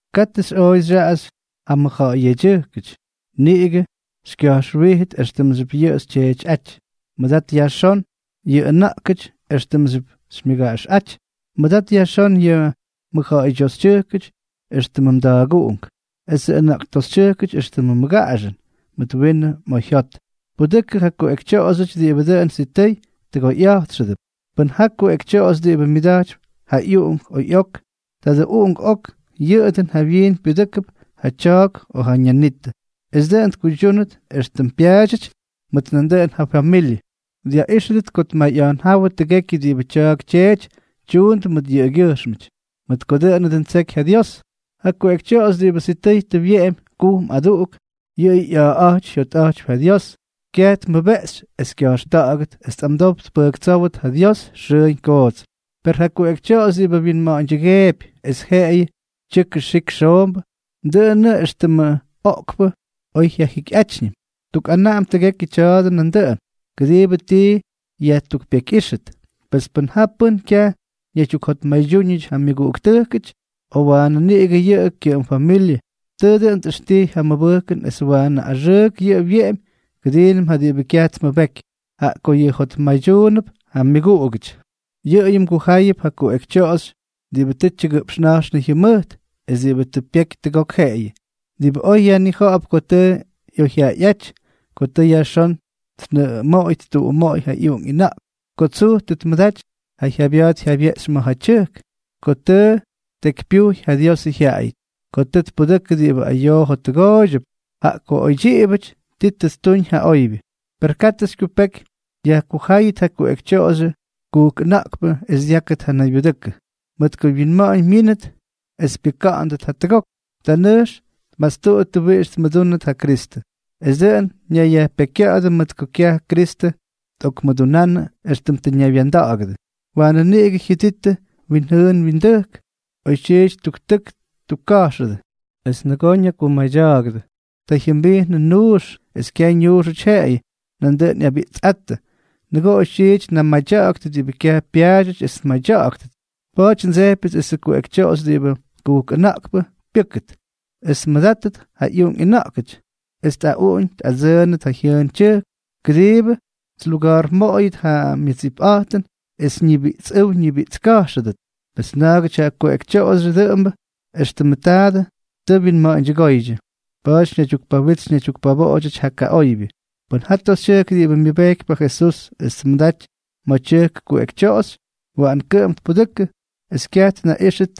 Katʉ xyꞌooy xyaꞌaxy ja mʉjja̱ꞌa̱y yedyʉjkʉty; niꞌigʉ xykya̱jxwíjʉt éxtʉmxyʉp yʉꞌʉ xytyeetyꞌáty. Mʉdat yajxón yʉ ʉna̱ꞌktʉjkʉty éxtʉmxyʉp xymyʉgaꞌaxꞌáty. Mʉdat yajxón yʉ mʉjja̱ꞌa̱ydyoxytyʉjkʉty éxtʉmʉ mda̱a̱guꞌunk, esʉ ʉna̱ꞌktoxytyʉjkʉty éxtʉmʉ mmʉgaꞌaxʉn, mʉt winʉ oyjyot. Pudʉkʉ ja kuꞌekytyoꞌoxyʉty diꞌibʉ dʉn sitʉy tʉgoyꞌa̱jtxʉdʉp. Pʉn jaa kuꞌekytyoꞌoxy diꞌibʉ myʉdajtypy ja ꞌyuꞌunk o ꞌyok, tadʉ uꞌunk ok yʉꞌʉ dʉn jawyiin pyudʉ́kʉp ja tya̱a̱k o ja ñanitʉ, es dʉꞌʉn tkuydyúnʉt éxtʉm pyaadyʉty mʉt nandʉꞌʉn ja fyamilyʉ, dyaꞌíxʉt ko tmayꞌa̱jnjáwʉ tʉgekyʉ diꞌibʉ tya̱a̱k tyeety tyuundʉ mʉt yʉꞌʉgyʉjxmʉty, mʉt ko dʉꞌʉnʉ dʉn ttseky ja Dios. Ja kuꞌekytyoꞌoxy diꞌibʉ sitʉy tʉ wyeꞌemy kujm aduꞌuk, yʉꞌʉyʉ ꞌya̱a̱ꞌa̱jty jyotꞌa̱jtypy ja Dios, kyaj tmʉbeꞌxy es kya̱jxta̱ꞌa̱gʉt es tꞌamdow tpʉjktsówʉt ja Dios xʉʉñ koots. Per ja kuꞌekytyoꞌoxy diꞌibʉ winma̱ꞌa̱ñdyʉgeepy es jeꞌeyʉ tyʉkʉ xik xoombʉ, dʉꞌʉnʉꞌʉ éxtʉmʉ oꞌkpʉ oy jyajikyꞌátyñʉm. Tukꞌanaꞌam tʉgekyʉ tya̱a̱dʉ nandʉꞌʉn, kʉdiibʉ tii yajtukpekyꞌíxtʉt. Pes pʉn ja pʉ́n kyaj ñaydyukjotmaydyúñʉty ja myʉguꞌuktʉjkʉty, o waanʉ niꞌigʉ yʉ kyʉꞌʉm familyʉ, tʉʉ dʉn tꞌʉxtijy ja mʉbʉjkʉn es waanʉ axʉʉk yʉꞌʉ wyeꞌemy kʉdiinʉm ja diꞌibʉ kyaj tmʉbeky, jaꞌa ko yʉꞌʉ jotmaydyuunʉp ja myʉguꞌugʉty. Yʉꞌʉyʉ mgujáyʉp ja kuꞌekytyoꞌoxy diꞌibʉ tʉ tyʉgʉꞌpxna̱jxnʉ jyʉmʉjt es diꞌibʉ tʉ pyeky tʉgok jeꞌeyʉ, diꞌibʉ oy yajnija̱ꞌa̱p ko tʉ ꞌyoyjyaꞌayꞌáty, ko tʉ yajxón tnʉꞌʉmoꞌoy ttuꞌumoꞌoy ja ꞌyuꞌunk ꞌyʉna̱ꞌk, ko tsuj tʉ tmʉdaty ja jyabya̱a̱t jyabyeꞌxy ma̱ ja tyʉjk, ko tʉ ttekypyujy ja Diosʉ jyaꞌayʉty, ko tʉ tpudʉkʉ diꞌibʉ ayoo jottʉgooydyʉp, jaꞌa ko oydyiꞌibʉty ti tʉ ttuñ ja oybyʉ. Per katʉ xykyupeky yajkujáyʉt ja kuꞌekytyoꞌoxyʉ kujk ʉna̱ꞌkpʉ es dyákʉt ja naybyudʉkʉ. Mʉt ko wyinma̱ꞌa̱ñ myínʉt es pyʉka̱ꞌa̱ndʉt jatʉgok, ta nʉjx tmastuꞌuttʉ wiꞌix tmʉdúnʉt ja Kristʉ, es dʉꞌʉn ñayyajpekykya̱ꞌa̱dʉ mʉt ko kyaj Kristʉ tꞌokmʉdunánʉdʉ éxtʉm tʉ ñaywya̱nda̱ꞌa̱gʉdʉ. Waanʉ niꞌigʉ jyʉdittʉ wyinjʉʉn wyindʉjk, oytyiity ttuktʉk ttukka̱jxʉdʉ es nʉgoo ñakumadya̱a̱gʉdʉ. Ta jyʉmbijnʉdʉ nuux; es kyaj ñuuxʉty jeꞌeyʉ, nandʉꞌʉn ꞌyabiꞌtsꞌáttʉ, nʉgoo oytyiity tnamadya̱ꞌa̱ktʉ diꞌibʉ kyaj pyaadyʉty es tmadya̱ꞌa̱ktʉt. Pa̱a̱ty ndsejpyʉts esʉ kuꞌekytyoꞌoxy diꞌibʉ kujk ʉna̱ꞌkpʉ pyʉ́kʉt, es tmʉdátʉt ja ꞌyuꞌunk ꞌyʉna̱ꞌkʉty, es tꞌaꞌuꞌuñ tꞌadsʉʉnʉt ja jyʉʉn tyʉjk, kʉdiibʉ tluga̱a̱rmoꞌoyʉt ja nmʉdsipꞌa̱jtʉm es ñibiꞌtsꞌʉ́w ñibiꞌtska̱jxʉdʉt. Pes na̱a̱gʉty ja kuꞌekytyoꞌoxyʉ dʉꞌʉmbʉ éxtʉmʉ taadʉ tʉ wyinma̱ꞌa̱ñdyʉgóydyʉ. Pa̱a̱ty ñaydyukpawitsy ñaydyukpaboꞌodyʉty ja kaꞌoybyʉ. Pʉn jaa toxytyʉjk diꞌibʉ myʉbejkypy ja Jesús es tmʉdaty ma̱ tyʉjk kuꞌekytyoꞌoxy, waꞌan kʉꞌʉm tpudʉkʉ, es kyaj tnaꞌíxʉt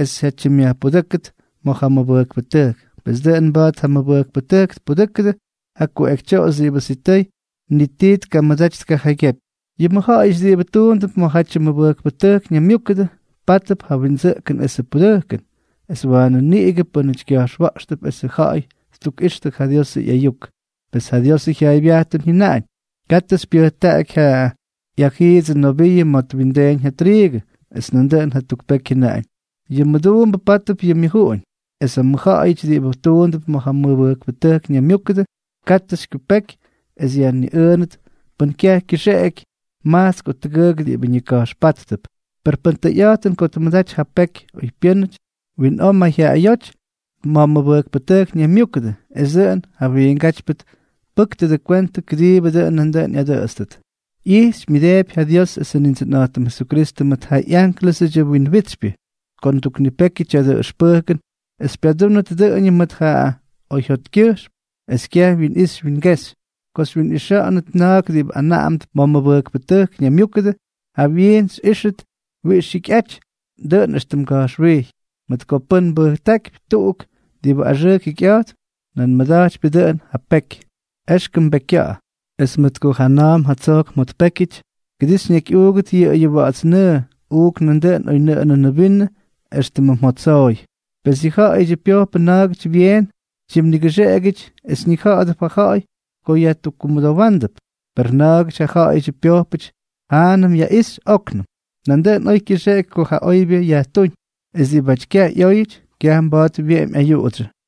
es jyatyimꞌyajpudʉ́kʉt ma̱ ja mʉbʉjkpʉtʉjk; pes dʉꞌʉn mba̱a̱t ja mʉbʉjkpʉtʉjk tpudʉ́kʉdʉ ja kuꞌekytyoꞌoxy diꞌibʉ sitʉy ni tii tkamʉdaty tkajaygyepy. Yʉ mʉjja̱ꞌa̱yʉty diꞌibʉ tuundʉp ma̱jatyʉ mʉbʉjkpʉtʉjk ñaymyúkʉdʉ, pátʉp ja windsʉꞌkʉn esʉ pudʉjkʉn, es waanʉ niꞌigʉ pʉ́nʉty kya̱jxwa̱ꞌxtʉp esʉ ja̱ꞌa̱y ttukꞌixtʉ ja Diosʉ ꞌyayuk. Pes ja Diosʉ jyaaybyajtʉn jyʉnaꞌañ: “Katʉ xypyʉjtaꞌaky ja ꞌyajiidsʉ noviiʉ ma̱ twindeeñ ja triigʉ.” Es nandʉꞌʉn jatuk peky jyʉnaꞌañ: “Yʉ mʉduumbʉ pátʉp yʉ myʉjuꞌuñ.” Es ja mʉjja̱ꞌa̱yʉty diꞌibʉ tuundʉp ma̱ ja mʉbʉjkpʉtʉjk ñaymyúkʉdʉ, katʉ xykyupeky es yajniꞌʉʉnʉt pʉn kyaj kyʉxeꞌeky majtsk o tʉgʉʉk diꞌibʉ ñika̱jxpáttʉp. Per pʉn tʉyꞌa̱jtʉn ko tmʉdaty ja peky oypyʉ́nʉty, winꞌoo mayjyaꞌayóty ma̱ mʉbʉjkpʉtʉjk ñaymyúkʉdʉ, es dʉꞌʉn ja wiingátypyʉ tpʉ́ktʉdʉ kwentʉ kʉdiibʉ dʉꞌʉn nandʉꞌʉn ꞌyadʉꞌʉtstʉt. ꞌYijxypy myʉdeepy ja Dios esʉ Nindsʉnꞌa̱jtʉm Jesukristʉ mʉt ja ꞌyánklʉsʉdyʉ wyinwitsypyʉ, ko nduknipekyʉ tya̱dʉ ʉxpʉjkʉn es xypyadúnʉt dʉꞌʉñʉm mʉt ja oyjyotkyʉjxm, es kyaj winꞌixy wingexy. Ko xywyinꞌixa̱ꞌa̱nʉt na̱a̱k diꞌibʉ anaꞌamʉp ma̱ mʉbʉjkpʉtʉjk ñaymyúkʉdʉ, jawyiin xyꞌíxʉt wiꞌix jyikyꞌaty, dʉꞌʉn éxtʉm nga̱jxwijy, mʉt ko pʉn mbʉjtákypy tuꞌuk diꞌibʉ axʉʉk jikyꞌa̱jtp, nan mmʉda̱jtypyʉ dʉꞌʉn ja peky. Exkʉm mbekykya̱ꞌa̱. Es mʉt ko jana̱a̱m jatsojk mjotpékyʉty, kʉdii xyñakyꞌuugʉt yʉꞌʉyʉ wa̱ꞌa̱ts nʉʉ, uuk nandʉꞌʉn oynʉꞌʉnʉnʉ vinʉ éxtʉmʉ jottsooy. Pes yʉ ja̱ꞌa̱yʉdyʉ pyojpʉ na̱a̱gʉty byeen tyimnigʉxeꞌegyʉty es ñija̱ꞌa̱dʉp ja ja̱ꞌa̱y ko yajtukkumʉdowándʉp, per na̱a̱gʉty ja ja̱ꞌa̱yʉdyʉ pyojpʉty jaanʉm yaꞌixy óknʉm. Nandʉꞌʉn oy kyʉxeꞌeky ko ja oybyʉ yajtúñ; es diꞌibáty kyaj ꞌyóyʉty, kyaj mba̱a̱t wyeꞌemy ayuꞌudsyʉ.